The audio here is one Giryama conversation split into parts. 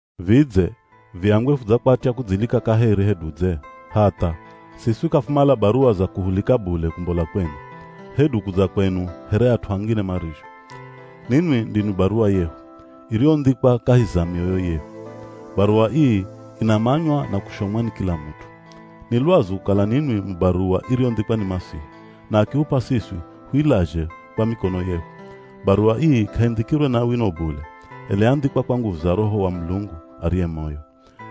Vidze, viambwe fudzakwatya kudzilika kaheri hedu dze? Hatha, siswi k'afumala baruwa za kuhulika bule kumbola kwenu, hedu kudza kwenu here at'u angine marizho. Ninwi ndinwi baruwa yehu, iriyondhikwa kahi za mioyo yehu. Baruwa ii inamanywa, na kushomwa ni kila mut'u. Ni lwazu kukala ninwi mu baruwa iriyondhikwa ni Masihi, na akihup'a siswi huilazhe kwa mikono yehu. Baruwa ii k'aindhikirwe na wino bule, ela yandhikwa kwa nguvu za Roho wa Mulungu ariye moyo.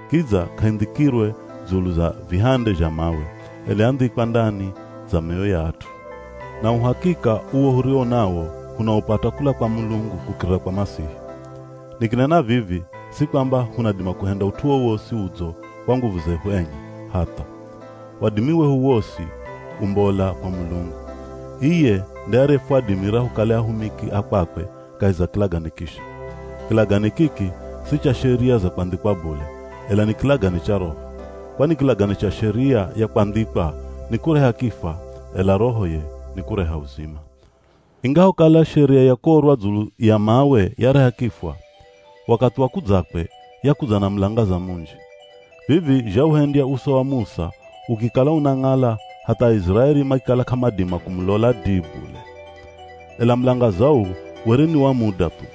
Kidza k'aindhikirwe dzulu za vihande zha mawe, ela yandhikwa ndani za mioyo ya at'u. Na uhakika uwo huriwo nawo hunaupata kula kwa Mulungu kukirira kwa Masihi. Nikinena vivi si kwamba hunadima kuhenda ut'u wowosi udzo kwa nguvu zehu enye, hatha! Wadimi wehu wosi umbola kwa Mulungu. Iye nde ariyefwadimira hukale ahumiki a kwakwe kahi za kilagane kisha. Kilagane kiki si cha Sheria za kwandhikwa bule, ela ni kilagane cha Roho. Kwani kilagane cha Sheria ya kwandhikwa nikureha kifwa ela Roho ye nikureha uzima. Ingahokala Sheria ya kuorwa dzulu ya mawe yareha kifwa, wakathi wa kudzakwe yakudza na mulangaza munji. Vivi zhauhendya uso wa Musa ukikala unang'ala hatha Aiziraeli makikala k'amadima kumulola dii bule. Ela mulangaza uu were ni wa muda thu.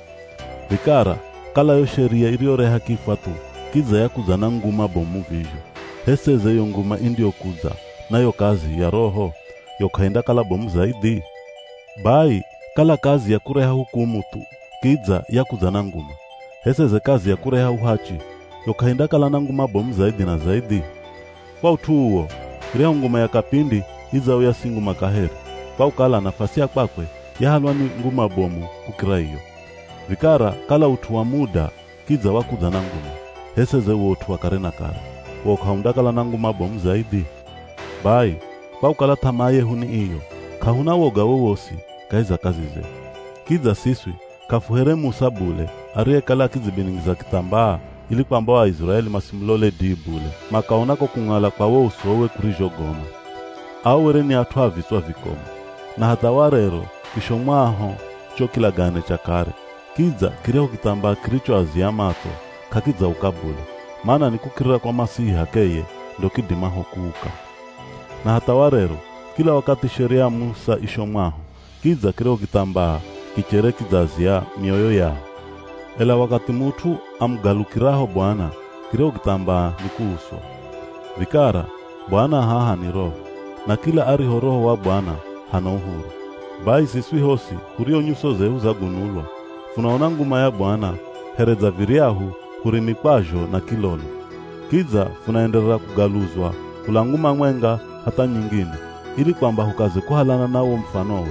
Vikara kala yo sheria iriyoreha kifwa thu kidza yakudza na nguma bomu vizho, h'e seze yo nguma indiyokudza na yo kazi ya Roho, yo k'aindakala bomu zaidhi? Bai, kala kazi ya kureha hukumu thu kidza yakudza na nguma, h'e seze kazi ya kureha uhachi, yo k'aindakala na nguma bomu zaidhi na zaidhi? Kwa ut'u uwo, iryahu nguma ya kapindi idzauya si nguma kaheri, kwa kukala nafasi ya kwakwe yahalwa ni nguma bomu kukira iyo. Vikara kala ut'u wa muda kidza wakudza na nguma, h'e seze wo ut'u wa kare na kare, wo k'aundakala na nguma bomu zaidhi? Bai, kwa kukala th'amaa yehu ni iyo k'ahuna woga wowosi kahi za kazi zehu. Kidza siswi k'afuhere Musa bule ariyekala akidzibiningiza kithambaa ili kwamba o Aiziraeli masimulole dii bule makaona ko kung'ala kwa wo usowe kurizhogoma. Ao were ni at'u a vitswa vikomu. Na hatha warero kishomwaho cho kilagane cha kare, kidza kiryahu kithambaa kirichoazia matso k'akidzauka bule, mana ni kukirira kwa Masihi h'akeye ndo kidimaho kuuka. Na hatha warero, kila wakathi Sheria ya Musa ishomwaho, kidza kiryahu kithambaa kichere kidzaazia mioyo yao. Ela wakathi mut'u amugalukiraho Bwana, kiryahu kithambaa ni kuuswa. Vikara, Bwana haha ni Roho, na kila ariho Roho wa Bwana hana uhuru. Bai siswi hosi hurio nyuso zehu zagunulwa, funaona nguma ya Bwana here dza viryahu hurimikwazho na kilolo. Kidza funaenderera kugaluzwa kula nguma mwenga hatha nyingine ili kwamba hukaze kuhalana na wo mufanowe.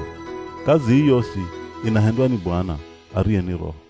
Kazi ii yosi inahendwa ni Bwana, ariye ni Roho.